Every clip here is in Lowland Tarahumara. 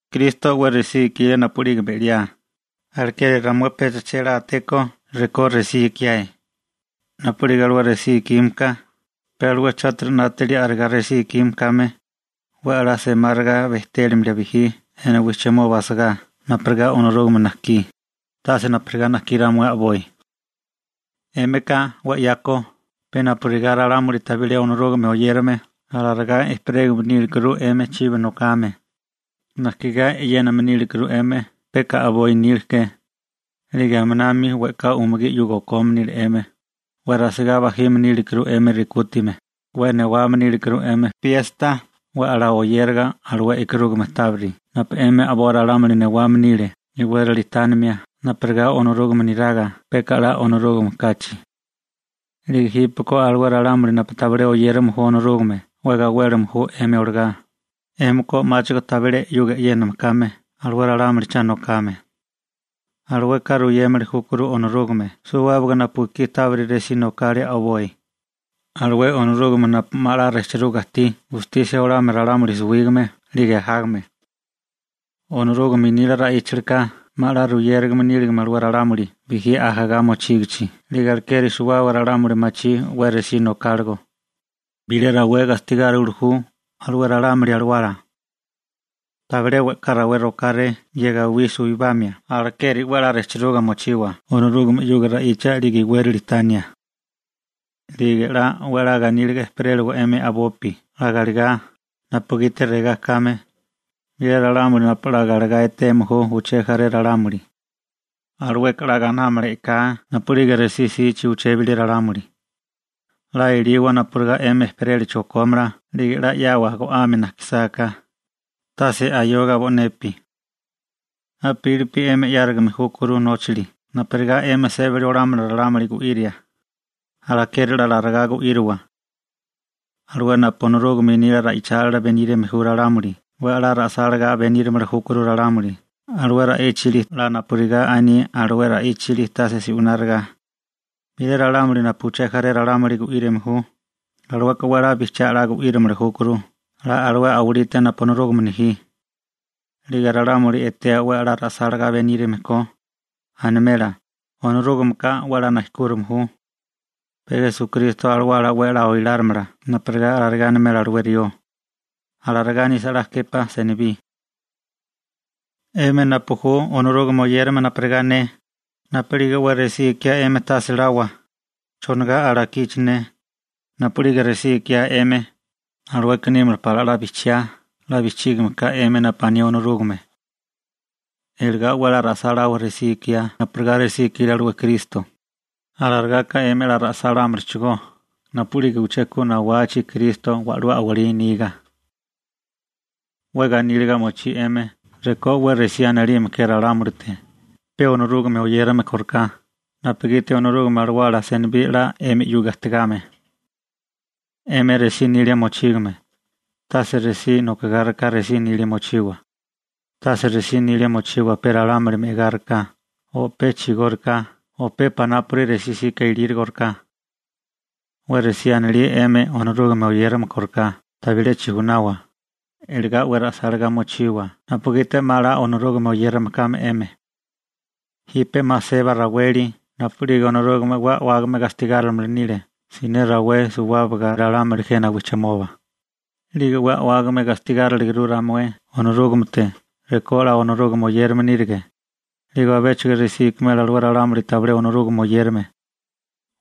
Kristo 'we resí ikile napu'lige me'liae, alekeri ramué pecha chélátéko rekó resí ikiae, napugiti alué resí ikime ka, pe alué chátiri 'nátili a'regá resí ikime kame 'we 'la semáriga bejtélimia bijí jena wijchimoba asagá napurigá Onorúgame najkí, tase napurigá najkiá ramué a'boi. 'Émika 'we 'yako pe napurigá ralámuli tabilé Onorúgame oyérame alarigá ejperégame nílekuru 'emi chibi nokame, najkigá e'yéname nílekuru 'emi peka a'boi nila ke, 'lige aminami we'ká umugí 'yuga okome nile 'emi, 'we rasigá bajime nílekuru 'emi rekútime, 'we newame nílekuru 'emi piesta 'we 'la oyériga alué e'karúgame tábiri napu 'emi a'boi ralámuli newame nile iwérali tánimia napurigá Onorúgame niraga peka 'la Onorúgame kachi. 'Lige jípeko alué ralámuli napu tabilé oyérame ju Onorúgame 'we gawélime ju 'emi olagá, 'émika 'máchigo tabilé 'yuga e'yéname kame alué ralámuli cha nokame. Alueka ruyémili júkuru Onorúgame suwábaga napu ekí tábiri resí nokale alué a'boi, alué Onorúgame napu 'ma 'la 'nátaga ajtí gatemia ralámuli suwígame 'lige ajágame 'yuga. Onorúgame nila ra'íchalika 'ma 'la ruyérigame níligame alué ralámuli bijí ajagá mochígichi 'lige alekeri suwábaga ralámuli machí 'we resí nokáligo. Bilé rawé gastigáriwili ju alué ralámuli alawala. Tabilé we'ká rawé rokáré ye gawí suwibamia alekeri 'we 'la 'nátaga mochiwa Onorúgame 'yuga ra'icha 'lige iwérali tania. 'Lige 'la 'we 'la ganíliga ejperéliwa 'emi a'bopi 'la galegá, napugiti regá kame: Bilé ralámuli napu 'la galegá eteme ju uché jaré ralámuli, alueka 'la gainámala e'ká napu'lige resí 'sichi uché bilé ralámuli. 'La eliwa napurigá 'emi ejperélachi okómala 'lige 'la 'yawa go'ame najkisáká, tase ayoga bo'nepi. A'pílipi 'emi 'yárigame júkuru nóchali napurigá 'emi sébali olámala ralámuli gu'íria, alekeri 'la alarigá gu'íriwa. Alué napu Onorúgame nila ra'ichálila benírame ju ralámuli 'we 'la ra'sálagá benírimili júkuru ralámuli alué ra'íchali 'la napurigá aní alué ra'íchali tase se'wináriga. Bilé ralámuli napu uché jaré ralámuli gu'írame ju, alueka 'we 'la bijchiá 'la gu'írimili júkuru 'la alué a'walite napu Onorúgame nejí. 'Lige ralámuli etea 'we 'la ra'sálagá benírime ko, animela: «Onorúgameka 'we 'la nejkúrime ju.» Pe Esukristo Alawala 'we 'la oilárimala napurigá alarigá animela alué rió. Alarigá nisa 'la képá senibí. 'Emi napu ju Onorúgame oyérame napurigá ne, napu'lige 'we resí ikiá 'emi tase lawa: «¿Chonigá alakiche ne?» Napu'lige resí ikiá 'emi, alueka nímala pala 'la bijchiá 'la bijchígime ka 'emi napu aní Onorúgame. Iligá 'we 'la ra'sáláwa resí ikiá napurigá resí ikile alué Kristo, alarigaka 'emi 'la ra'sálámalachigó napu'lige uché ku nawachi Kristo wa'lú a'walí niga. 'We ganíliga mochí 'emi rekó 'we resí anilime ke ralámulite pe Onorúgame oyérame kóriká napugiti Onorúgame Alawala senibí 'la 'emi 'yuga ajtigame. 'Emi resí nilia mochígame, tase resí nokogáriká resí nilia mochiwa, tase resí nilia mochiwa pe ralámuli me'agáriká o pe chigóriká o pe panápuri resí 'sika ilírigoriká. 'We resí anilía 'emi Onorúgame oyérame kóriká tabilé chijunawa, iligá 'we ra'sálagá mochiwa napugiti 'ma 'la Onorúgame oyérame kame 'emi. Jipe 'ma seba raweli napu'lige Onorúgame 'we a'wágame gastigárimili nile siné rawé suwábaga ralámuli jena wijchimoba, 'lige 'we a'wágame gastigáriliaguru ramué Onorúgamete rekó 'la Onorúgame oyérame nírige, 'lige abéchigo resí ikimela alué ralámuli tabilé Onorúgame oyérame.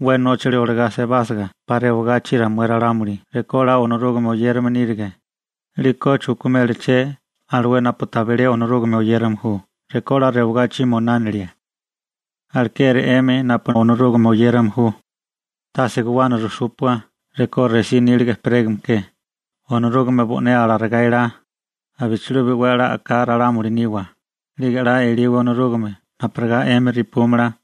'We nóchali olagá sebásiga 'pa rewagachi ramué ralámuli rekó 'la Onorúgame oyérame nírige, ¿'liko chukimélaché alué napu tabilé Onorúgame oyérame ju rekó 'la rewagachi moinánilie? Alekeri 'emi napu Onorúgame oyérame ju, tase guwana rujsúpua rekó resí níliga ejperégame ke, Onorúgame bo'né alarigá elá, abichilubi 'we 'la a'ká ralámuli niwa, 'lige 'la eliwa Onorúgame napurigá 'emi repúmala,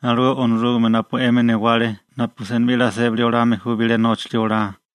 alué Onorúgame napu 'emi newale napu senibí 'la sébali olame ju bilé nóchali olá.